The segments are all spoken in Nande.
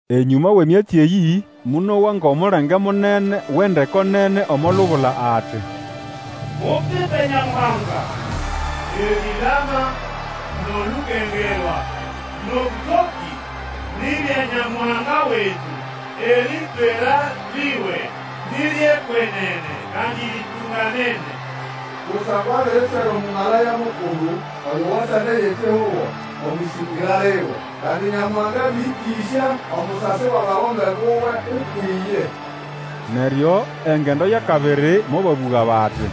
Enyũma wʼemyatsi eyĩ, monowa ngʼomulenge munene wʼendeko nene omo lubula ati, Mupipe Nyamuhanga! Erilama, nʼolukengerwa, nʼobũtokĩ, ni bya Nyamuhanga wetu! Eritswera liwe ni ryʼekwenene, kandi ritunganene! Kusangwa abiritswera Omũmalaya mukulu oyo watsandaya ekihugo omwʼĩsĩngĩra liwe. Kandi Nyamuhanga abĩrĩkĩsya omusasi wʼabagombe buwe ukwʼiye. Neryo engendo yʼakabiri mobabũga, bati,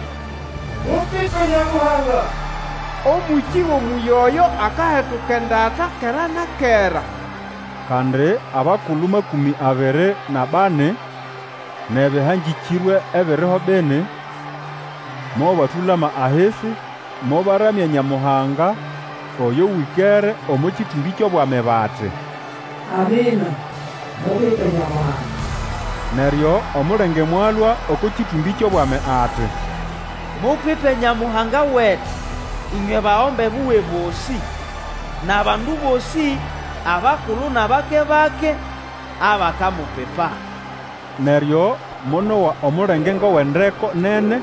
Mupipe Nyamuhanga! Omũkĩ wʼomũyĩ oyo akahetuka endata kera na kera! Kandi abakulu makũmĩ abiri nʼabani, nʼebĩhangĩkĩrwe ebiriho bini mobatũlama ahisi mobaramya Nyamuhanga oyo wĩkere omo kĩtũmbĩ kyʼobwami bati, Amina! Mupipe Nyamuhanga! Neryo omulenge mwalũa oko kĩtũmbĩ kyʼobwami ati, Mupipe Nyamuhanga wetu, ĩnywe bagombe buwe bosĩ, nʼabandu bosĩ abakulu nʼabake-bake, abakamupipa! Neryo monowa omulenge ngʼowʼendeko nene,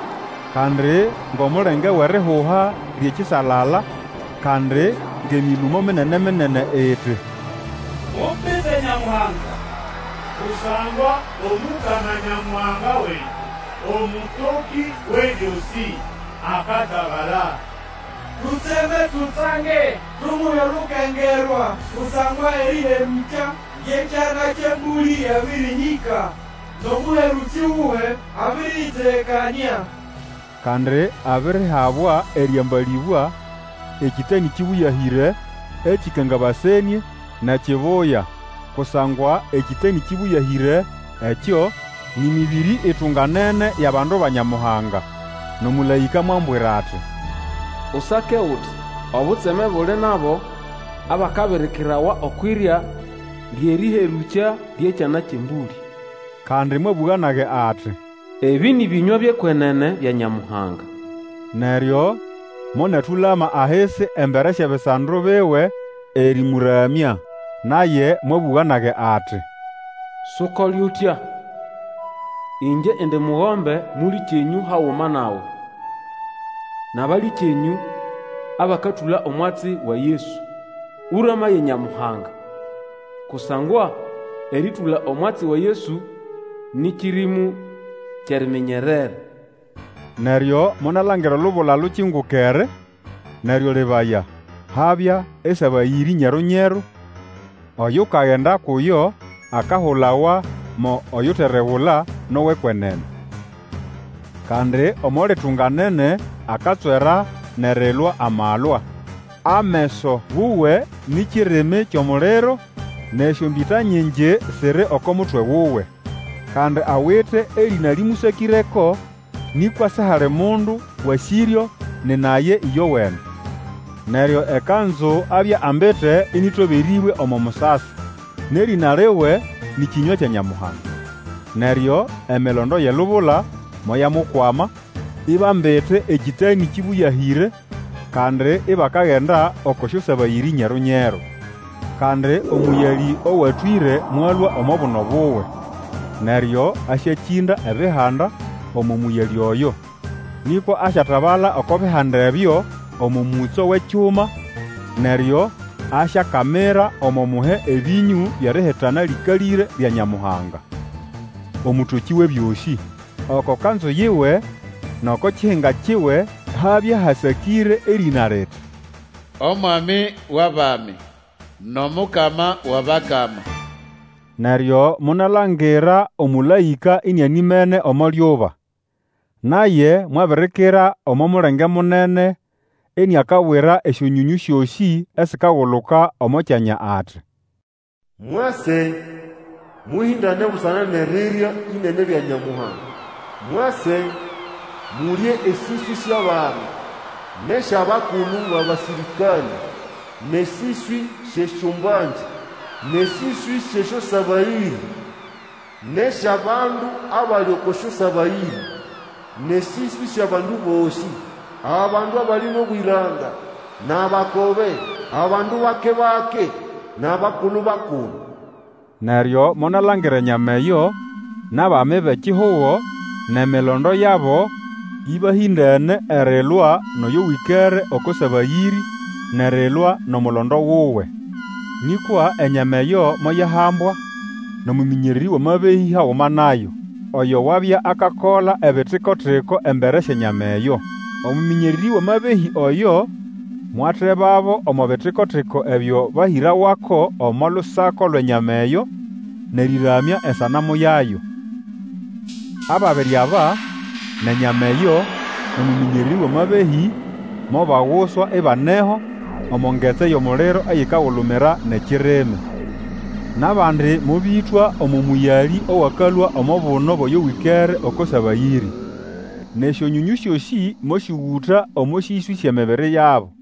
kandi ngʼomulenge wʼerihuha lyʼekisalala, kandi ngʼemĩlũmo minene-minene, iti, Mupipe Nyamuhanga! Kusangwa Omukama Nyamuhanga wetu Omũtokĩ Wʼebyosĩ, akatabala. Tutseme, tutsange, tumuhe olukengerwa! Kusangwa erĩherũkya lyʼEkyana kyʼEmbũlĩ lyabĩrĩhĩka, nʼomũherũkĩ wuwe abĩrĩyĩtegekanĩa. Kandi abirihabwa erĩambalĩbwa ekĩtanĩ kĩbũyahĩre, ekĩkangabasenĩe, nʼekibuya. Kusangwa ekĩtanĩ kĩbũyahĩre ekyo nĩ mĩbĩrĩ itunganene yʼabandu ba Nyamuhanga. Nʼomũlaĩka mwambwira ati, Usake uti, Obutseme buli nʼabo abakabirikirawa okwʼirya lyʼerĩherũkya lyʼEkyana kyʼEmbũlĩ. Kandi mwabũga nage ati, Ebĩ nĩ bĩnywa byʼekwenene bya Nyamuhanga. Neryo monatũlama ahisi embere syʼebisando biwe erĩmũramya. Naye mwabũga nage ati, Sukole utya! Ĩngye indi mugombe mũlĩkyenyũ haguma nawe, nʼabalĩkyenyũ abakatũla omwatsi wa Yesu. Ũramaye Nyamuhanga! Kusangwa erĩtũla omwatsi wa Yesu nĩ kĩrĩmũ kyʼeriminyerera. Neryo monalangira olubula ilukingukere, neryo lebaya, habya esabayĩrĩ nyeru-nyeru. Oyukagenda kuyo akahulawa mo Oyuteregula nʼowʼekwenene. Kandi omo litunganene akatswera nʼerilwa amalwa. Ameso wuwe ni kirimi kyʼomuliro, nʼesyombĩta nyingi siri oko mutwe wuwe. Kandi awite erĩna lĩmũsakĩreko, nĩkwa sihali mundu wasĩryo, nina ye ĩyowene. Neryo ekanzu abya ambite ĩnĩtoberĩbwe omo musasi, nʼerĩna liwe nĩ Kĩnywa kya Nyamuhanga. Neryo emilondo yʼelubula moyamukwama, ibambite ekĩtanĩ kĩbũyahĩre, kandi ibakagenda oko syosabayĩrĩ nyeru-nyeru. Kandi omũyalĩ owatwĩre mwalũa omo buno buwe. Neryo asyakĩnda ebihanda omo mũyalĩ oyo. Nĩkwa asyatabala oko bihanda ebyo, omo mũtso wʼekyuma, neryo asyakamira omo muhe ebĩnyũ byʼerihitana lĩkalĩre lya Nyamuhanga, Omũtokĩ Wʼebyosĩ. Oko kanzu yiwe nʼoko kihinga kiwe habya hasakĩre erĩna liti, Omwami wʼabami, nʼOmukama wʼAbakama. Neryo monalangira omũlaĩka inianimene omo lyuba. Naye mwabirikira omo mulenge munene iniakabwira esyonyonyũ syosĩ esikaguluka omo kyanya ati, Mwase, mũhĩndane busana nʼerirya ĩnene lya Nyamuhanga! Mwase, mulye esĩswĩ syʼabami, nʼesyʼabakulu bʼabasĩrĩkanĩ, nʼesĩswĩ syʼesyombangĩ, nʼesĩswĩ syʼesyosabayĩrĩ, nʼesyʼabandu abali oko syosabayĩrĩ, nʼesĩswĩ syʼabandu bosĩ, abandu abali nʼobwĩranda, nʼabakobe, abandu bake-bake, nʼabakulu-bakulu! Neryo monalangira enyama eyo, nʼabami bʼekihugo, nʼemilondo yabo, ĩbahĩndene erilwa nʼoyo wĩkere oko sabayĩrĩ, nʼerilwa nʼomulondo wuwe. Nĩkwa enyama eyo moyahambwa, nʼomũmĩnyererĩ wʼamabehĩ haguma nayo, oyo wabya akakola ebitiko-tiko embere syʼenyama eyo. Omũmĩnyererĩ wʼamabehĩ oyo mwatebabo omo bitiko-tiko ebyo bahĩrawako omo lusako lwʼenyama eyo, nʼerĩramya esanamu yayo. Ababiri aba, nʼenyama eyo, nʼomũmĩnyererĩ wʼamabehĩ, mobaguswa ibaneho, omo ngetsi yʼomuliro eyikagulumira nʼekirimi. Nʼabandi mobĩtwa omo mũyalĩ owakalũa omo buno bwʼoyo wĩkere oko sabayĩrĩ, nʼesyonyonyũ syosĩ mosyũgũta omo sĩswĩ syʼemibiri yabo.